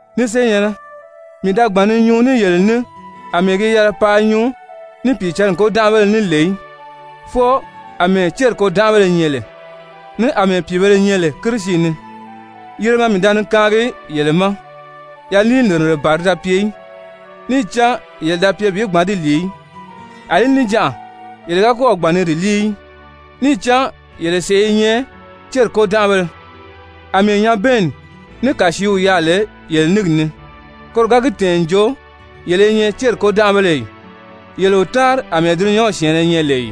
Ni senyɛ̀nnɛ, mii da gbàn ni nyuu ní yele ní àmɛɛ gi yɛlɛ paa nyuu ní Pìicǎnni kôdanʔabéle ní lè í, fwɔɔ àmɛɛ céri kôdanʔabéle nyɛ lè, ní àmɛɛ pìibēle nyɛ lè Kirisi ni. Yiremɛ mii da ni kaangi yele ma, yaliinirire ban ti da pye í, níì cán yele da pye bi gbǎn di lìi í. Alí níjanʔa yele ga kɔ́ɔ̀ gbàn ni di líi í, níì cán yele sèʔé i nyɛ céri kôdanʔabéle. Amɛɛ nyabɛɛnni ní kàsiiw yaà lè yele níngi ni, koro ga gi tɛ̀ɛn n jo yele i nyɛ céri kôdanʔabéle ì? Yele o táanri àmɛɛ dulunyanw syɛ̀ɛnnɛ nyɛ lè ì?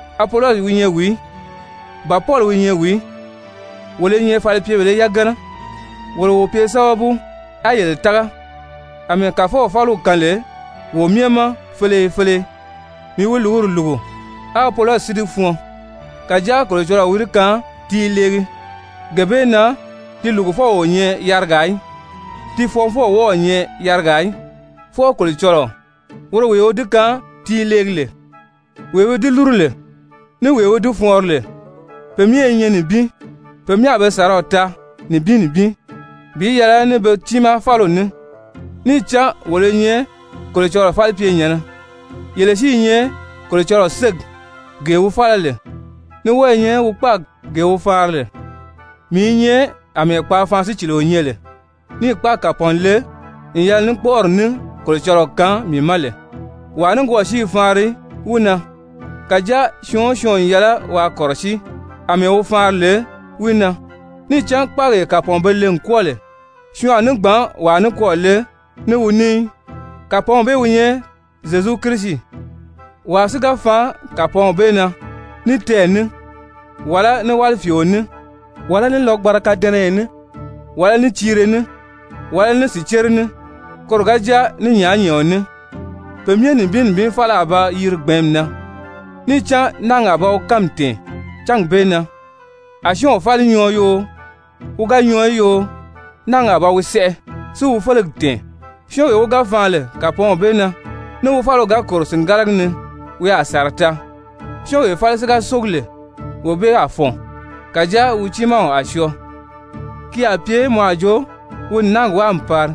Apolɔsi wi nyɛ wìí? Ba Pɔli wi nyɛ wìí? Wolo i nyɛ falipyebèlē yagana, wolo wo pye sábabu á yele tága, àmɛɛ Kàfɔw fáliw kaan lè wo myɛ ma feleye feleye. Mii wi lùguri lùgu, á Apolɔsi si di fɔɔn, kàjáa Kolocɔlɔɔ wi di kaan ti i leegi. Gee bee na ti lùgufɔw o nyɛ yarigaa í, ti fɔɔnfɔw o wɔ́ɔ̄ nyɛ yarigaa í, fwɔɔ Kolocɔlɔɔ, woro wee wi di kaan ti i leegi lè. Wee wi di lúru lè ní wee wi di fɔɔnri lè, pe myɛ i nyɛ nibin. Pe myɛ a be sàraw taa nibin nibin bi yɛlɛ ní be tiimaa fáliw ní. Níì cán wolo i nyɛ Kolocɔlɔɔ falipyenyɛ̀nnɛ. Yele si i nyɛ Kolocɔlɔɔ ségi gee wi fála lè, ní wɔ́ɔ i nyɛ wi kpáagi gee wi faanri lè. Mii i nyɛ àmɛɛ kpaafaan-sícilio nyɛ lè níì kpáagi kàpɔɔn le n yɛlɛ ní kpɔ́ʔɔri ní Kolocɔlɔɔ kaan mii ma lè, wàa nikwɔɔ si i faanri wi na. Kàjáa syɔɔn o syɔɔn n yɛlɛ waa kɔ̀rɔsíi àmɛɛ wi faanri lè wi na. Níì cán kpáagee kàpɔɔn be le n kwɔ́ɔ lè, syɔɔn a ní gbǎn wàa nikwɔɔ le ní wi ní í, kàpɔɔnw bee wi nyɛ Zyezu Kirisi. Wàa si ga faan kàpɔɔnw bee na ní tɛɛ̀ ní, wàlá ní wálifiio ní, wàlá ní lɔgbanra kadɛnɛyɛ ní, wàlá ní tiire ní, wàlá ní sìcere ní, koro ga jáa ní nyàányɛɛɔn ní, pe myɛ nibin nibin fáli a ba yiri gbɛ̀ɛ́nmi na. Níì cán náagi a ba wi kánmi tɛ̀ɛn cángi bee na, a syɔ́ɔnw fáli nyɔɔ yoo, wi ga nyɔɔ í yoo, náagi a ba wi sɛʔɛ, si wi félegi tɛ̀ɛn. Syɔ́ɔnwee wi ga faan lè kàpɔɔnw bee na, ní wi fáliw ga kòro sìngalagi ni, wi a sàra taa. Syɔ́ɔnwee fáli si ga sógi lè, wee bee a fɔ̀n. Kàjáa wi tiimaa a syɔɔ, ki a pye mɔ a jo wi n náagi wáa n pari.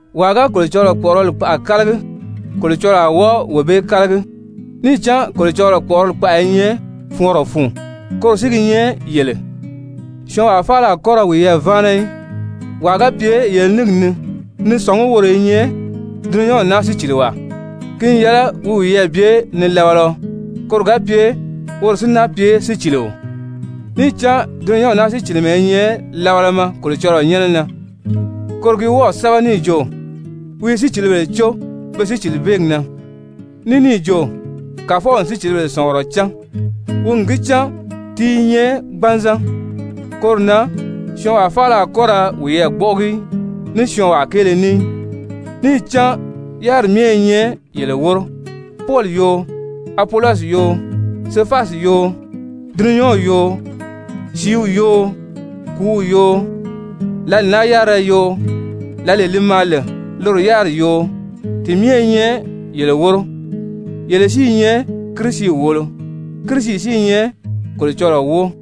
Wàa ga Kolocɔlɔɔ kpɔ̀ʔɔrɔli kpaʔa kálagi, Kolocɔlɔɔ a wɔ́ɔ wee bee kálagi. Níì cán Kolocɔlɔɔ kpɔ̀ʔɔrɔli kpaʔa i nyɛ fɔɔnrɔ fun, koro si gi nyɛ yele. Syɔɔnwaa faala a kɔ́ ra wiyɛɛ váana í, wàa ga pye yele níngi ni ni sɔ̀ngí woro i nyɛ dulunyanw naa síciliwaa, ki n yɛlɛ wi wiyɛɛ bye nilabalaɔ, koro ga pye woro si náa pye sícilio. Níì cán dulunyanw naa sícilimɛ i nyɛ labalama Kolocɔlɔɔ nyɛ́nɛ na. Koro gi wɔ́ɔ̀ sɛ́bɛ níì jo: «Wi i sícilibèle có be sícilibeegi na.» Ní níì jo: «Kàfɔw n sícilibèle sɔ̀ngurɔ cán, wi n gi cán ti i nyɛ gbanzan.» Koro na syɔɔnwaa faala a kɔ́ ra wiyɛɛ gbɔ́ʔɔgi ní syɔɔnwaa kéele ní í. Níì cán yáriri myɛ i nyɛ yele wóro, Pɔli yoo, Apolɔsi yoo, Sefasi yoo, dulunyanw yoo, sìíw yoo, kùúw yoo, lǎli naa yárira yoo, lǎlee li maa lè loro yáriri yoo. Ti myɛ i nyɛ yele wóro, yele si i nyɛ Kirisi wòolo, Kirisi si i nyɛ Kolocɔlɔɔ wóo.